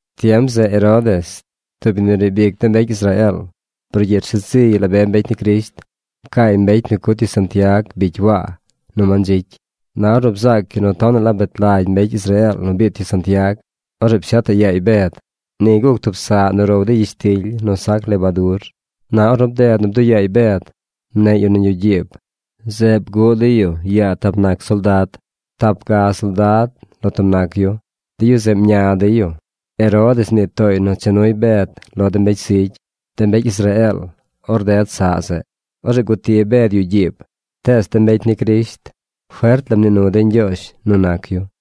Tiem zeꞌ Herodes, tub yu nu riib ic de mbecy Israeel, brugyiꞌ rsheed ziy la be mbecy ni Crisht. Pcaay mbecy nu cut yu Santiag bicy Waa, nu mandzicy. Na ornu bzaac yu nu tonaꞌ la bet lagy mbecy Israeel nu biit yu Santiag, orzeꞌ pshetaꞌ yaay Bed. Ni guc tub saꞌ nu row dey gyishtily nu sac lebadur. Na ornu bded nu bduꞌ yaay Bed, mneꞌy yu nañ yuꞌ gyiib. Zeꞌ bguꞌ dey yu yaa tap nac soldad. Tap ga soldad lo tub nac yu. De yu zeꞌ mña dey yu. Herodes mnii tooy nu cha nuy Bed lo de mbecy zigy, de mbecy Israeel or ded saꞌ zeꞌ. Orzeꞌ guti Bed yuꞌ gyiib, tees de mbecy ni Crisht fert la mnii nu dey Ñgyoozh nu nac yu.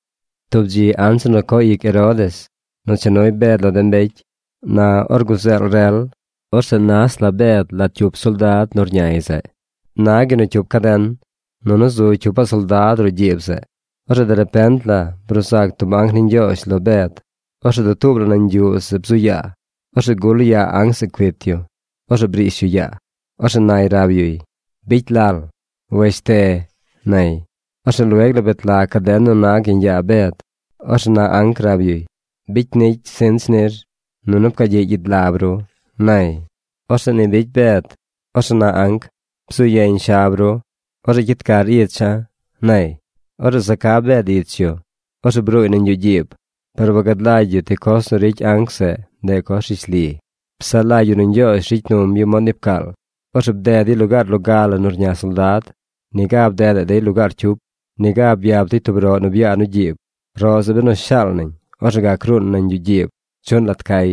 Tub dzi anzir nu co ic Herodes nu cha nuy Bed lo de mbecy, na or guzeel rel, orzeꞌ nas la Bed lat cyup soldad nu rñay zeꞌ. Nag yu nu cyup caden. Nunu zu cyupaꞌ soldad roꞌ gyiib zeꞌ. Orzeꞌ derepent la bruu zac tub anc ni Ñgyoozh lo Bed. Orzeꞌ dutuub la nañ yuꞌ zeꞌ bzu yaa. Orzeꞌ gul yaa anc zeꞌ cuit yu. Orzeꞌ brish yu yaa. Orzeꞌ nay rab yuy: ―¡Bicy lal! ¡Weshte! ―nay. Orzeꞌ lueg la bet lag caden nu nag yeñ yaa Bed. Orzeꞌ na anc rab yuy: ―Bicy nicy sinch nir, nunu pcaa gyiꞌ gyid lab ru ―nay. Orzeꞌ ni bicy Bed. Orzeꞌ na anc: ―Bzuu yeñ shab ru. Orzeꞌ cyid car icha̱ ―nay. Orzeꞌ za ca Bed ich yu. Orzeꞌ bruuy nañ yuꞌ gyiib. Par wangad lagy yu ti coz nu ricy anc zeꞌ ndeꞌ coz rishli. Psaꞌ lagy yu nu Ñgyoozh ricy num yu mod ni pcaal. Orzeꞌ bded dey lugaar loga la nu rña soldad. Niga bdedaꞌ dey lugaar cyup. Niga byap dey tub roꞌ nu byaa nu gyiib. Roꞌ zeꞌ benu shaal nañ, orzeꞌ gac ruun nañ yuꞌ gyiib chuꞌn lat cay.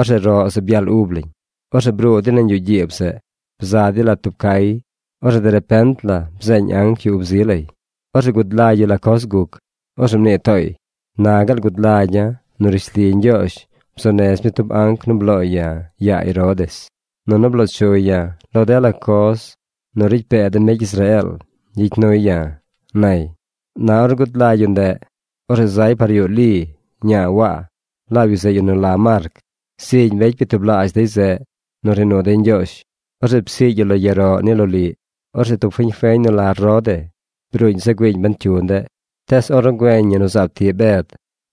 Orzeꞌ roꞌ zeꞌ byaal ub lañ. Orzeꞌ bruu dey nañ yuꞌ gyiib zeꞌ. Bza dey lat tub cay. Orzeꞌ derepent la bzeeñ anc yu ub zi lay. Orzeꞌ gud lagy yu la coz guc. Orzeꞌ mnii tooy: ―Na gaal gud lagya̱ nu rishli Ñgyoozh bzuu nez mi tub anc nu blooy ya̱ yaa Herodes, nunu bloo chuy ya̱ lo dela coz nu ricy pee de mbecy Israeel gyicy nuy ya̱ ―nay. Na ornu gud lagy yu ndeꞌ, orzeꞌ zay par yuꞌ Li, ñaa Waa, laab yu zeꞌ yu nu la Marc. Zigy mbecy byatublaazh dey zeꞌ nu rnii nu dey Ñgyoozh. Orzeꞌ psiigy yu lo yaroꞌ ni loliꞌ. Orzeꞌ tub fiñ feñ nu la Rode bruuñ za güiiñ ben cyu ndeꞌ. Tees ornu güeñ ñi nu zaab tiꞌ Bed,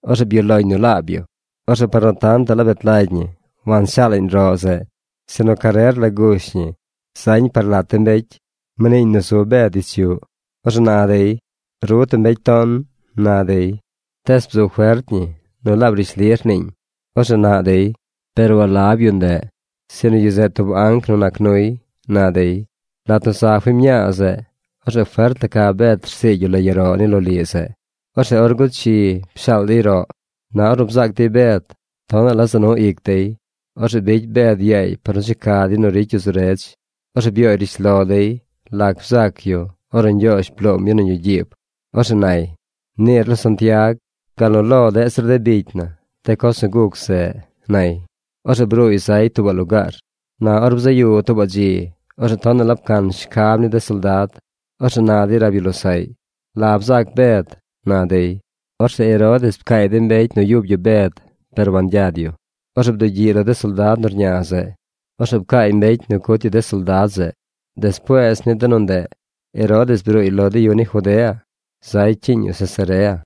orzeꞌ byuꞌ loñ nu laab yu. Orzeꞌ par nu tantaꞌ la bet lagy ñi wanshaalaꞌñ roꞌ zeꞌ sinu carer la gush ñi zañ par lat de mbecy. Mniiñ nu zu Bed ich yuꞌ. Orzeꞌ na dey: ―¡Ru tub mbecy ton! ―na dey. Tees bzu fert ñi nu laab rishli rniiñ. Orzeꞌ naꞌ dey: ―Par walab yu ndeꞌ, sinu yu zeꞌ tub anc nu nac nuy ―na dey. Lat nu za fiñ mñaa zeꞌ, orzeꞌ fert la ca Bed rsiigy yu lo yaroꞌ ni loliꞌ zeꞌ. Orzeꞌ or guchi pshaal dey roꞌ. Na ornu bzaac dey Bed, tonaꞌ la za nu ic dey. Orzeꞌ bicy Bed yaay par nu checa dey nu ricy yu zu redz. Orzeꞌ byooy rishlo dey lac bzac yu ornu Ñgyoozh bloom yu nañ yuꞌ gyiib. Orzeꞌ nay: ―Niir lo Santiag, gal nu lo deꞌ zir de bicy na de coz nu guc zeꞌ ―nay. Orzeꞌ bruuy zay tuubaꞌ lugaar. Na or bzaꞌ yu tuubaꞌ dzi, orzeꞌ tonaꞌ la pcan shcab ni de soldad. Orzeꞌ na dey rab yu losaꞌy: ―¿La bzac Bed? ―na dey. Orzeꞌ Herodes pcaay de mbecy nu yub yu Bed par wangyad yu. Orzeꞌ bdugyiꞌy lo de soldad nu rña zeꞌ. Orzeꞌ pcaay mbecy nu cut yu de soldad zeꞌ. Despuees ni de nu ndeꞌ, Herodes bruuy lo de yu ni Judea zay cyiiñ yu Cesarea.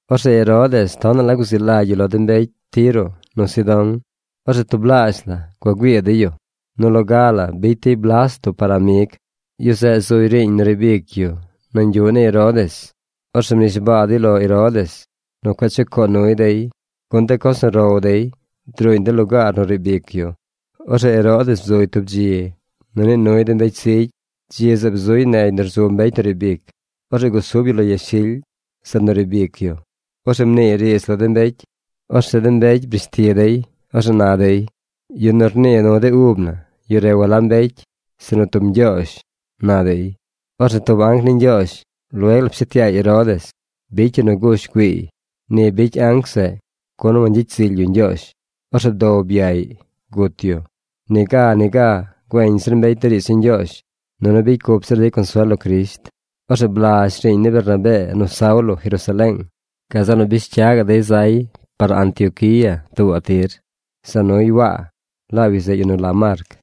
Orzeꞌ Herodes tonaꞌ la guzi lagy yu lo de mbecy Tiro nu Sidón. Orzeꞌ tublaazh la gua güii dey yu. Nu loga la bicy dey Blasto par amig. Yu zeꞌ zuy riiñ nu riib ic yu nañ yuꞌ ni Herodes. Orzeꞌ mnishbaa dey lo Herodes nu cueꞌ chucoo nuy dey, gun de coz nu row dey druuñ de lugaar nu riib ic yu. Orzeꞌ Herodes bzuy tub dzi nu nii nuy de mbecy zigy. Dzi zeꞌ bzuy negy nu rzu mbecy nu riib ic. Orzeꞌ gusub yu lo yashily, zeꞌ nu riib ic yu. Orzeꞌ mniiy riidz lo de mbecy. Orzeꞌ de mbecy brish ti dey. Orzeꞌ na dey: ―¡Yu nu rnii nu de ub na, yu re walab mbecy, sinu tub ñgyoozh! ―na dey. Orzeꞌ tub anc ni Ñgyoozh lueg la pshet yaay Herodes. Bicy yu nu gush güiiy. Ni bicy anc zeꞌ, gun wangyicy zily yu Ñgyoozh. Orzeꞌ bdow byaꞌy gut yu. Niga niga güeñ zir mbecy de riidz ni Ñgyoozh, nunu bicy cup zir dey consuel lo Crisht. Orzeꞌ blazh riiñ ni Bernabee nu Saulo Jerusaleeng. Gazeꞌ nu bish cya gaꞌ dey zay par Antioquía tuubaꞌ tir. Za nuy Waa. Laab yu zeꞌ yu nu la Marc.